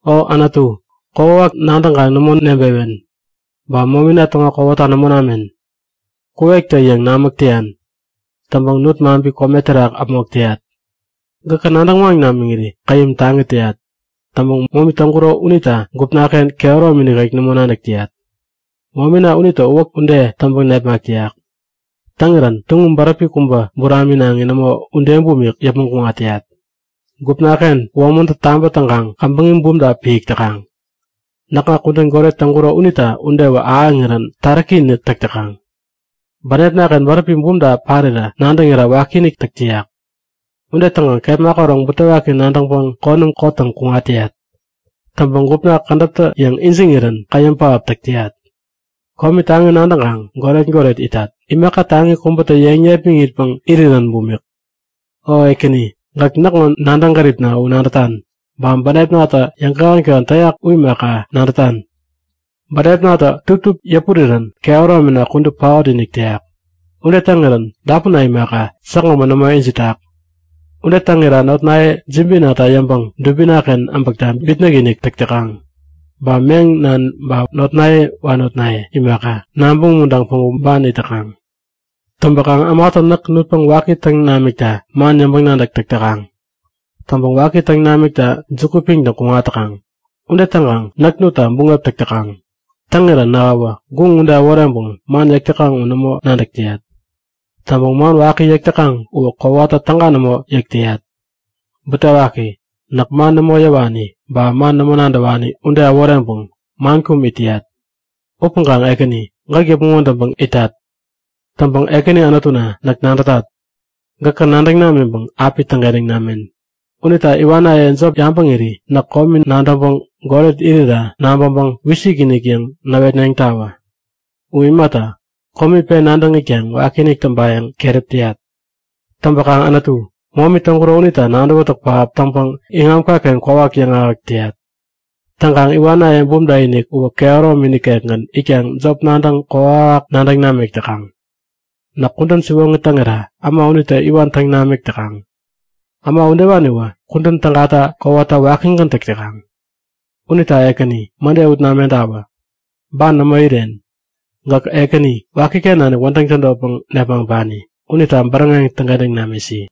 O Anutu, kokwawak nadäŋkaŋ nämo nebewen, ba momina täŋo kowata nämo namen. Gäk kuwektä-yäŋ namäk täyan. Täŋpäŋ nut-maŋpi kome terak äpmok täyat. Gäkä nadäŋ waŋ namiŋiri käyäm taŋi täyat. Täŋpäŋ momi täŋkuro unita gupnaken kehäromi nikek nämo nadäk täyat. Momina unitä uwäk ude täŋpäŋ nepmak täyak. Täŋirän tuŋum bäräpi kubä, buraminaŋi nämo, ude bumik yäpmäŋ kuŋat täyat. Gupnaken womäntä tabä täŋkaŋ käbäŋi bumta piäk täkaŋ. Näkŋa kudän goret täŋkuro unita udewä ahäŋirän taräki-inik täk täkaŋ. Bänepnaken bäräpi bumta parirä nadäŋira wakiinik täk täyak. Ude täŋkaŋ kepma käroŋ butewaki nadäŋpäŋ konäm kottäŋ kuŋat täyat. Täŋpäŋ gupna kädäptä-yäŋ ijiŋirän käyäm pähap täk täyat. Komi taŋi nadäŋkaŋ goret-goret itat, imaka taŋi kubätä yeŋ nepmäŋitpäŋ irirän bumik. O Ekäni, gäk näkŋo nadäŋ gäripna u nadätan, ba bänepnatä yäŋkähän-kähän täyak u imaka, nadätan. Bänepnatä tuptup yäpurirän kehäromina kudup paot-inik täyak. Ude täŋirän dapunna imaka, säkgämän nämo ijitak. Ude täŋira notnaye jibinata yäŋpäŋ dubinaken äbäkta bitnäk-inik täk täkaŋ. Ba meŋ nan ba notnaye wanotnaye imaka, nabäŋ umuntaŋpäŋ päŋku ban it täkaŋ. Täŋpäkaŋ ämatä näk nutpäŋ waki täŋ namikta man yäŋpäŋ-nadäk täk täkaŋ. Täŋpäŋ waki täŋ namikta juku piŋtäŋ kuŋat täkaŋ. Ude täŋkaŋ näk nutta buŋep täk täkaŋ. Täŋirä nähäwä guŋ ude äworeŋpäŋ man yäk täkaŋ u nämo nadäk täyat. Täŋpäŋ man waki yäk täkaŋ uwä kowata täga nämo yäk täyat. Butewaki! Näk man nämo yäwani, ba man nämo nadäwani ude äworeŋpäŋ man kum it täyat. Upäŋkaŋ Ekäni, gäk yäpmäŋ wädäŋpäŋ itat. Täŋpäŋ Ekäni Anutuna, näk nadätat; Gäkä nadäŋ namiŋpäŋ api täŋkentäŋ namen. Unita iwanaye jop yabäŋiri näk komi nadäŋpäŋ goret irira nabäŋpäŋ wisik-inik yäŋ näwetneŋtawä. U imata, komi pen nadäŋ itkaŋ wakinik täŋpayäŋ keräp täyat. Täŋpäkaŋ Anutu, momi täŋkuro unita nadäwätäk pähap täŋpäŋ iŋamkaken kwawak yäŋahäk täyat. Täŋ iwanaye bumta-inik uwä kehäromi nikekgän itkaŋ jop nadäŋ kokwawak nadäŋ namik täkaŋ. Näk kudän siwoŋi täŋira äma unitä iwan täŋ namik täkaŋ. Äma udewaniwä kudän tägata kowata wäkigän täk täkaŋ. Unita Ekäni, mäde ut namentawä! Ban nämo iren! Gäk Ekäni, wakiken nanik wädäŋ tädotpäŋ nepmaŋpani unita bäräŋeŋ täŋkentäŋ namisi!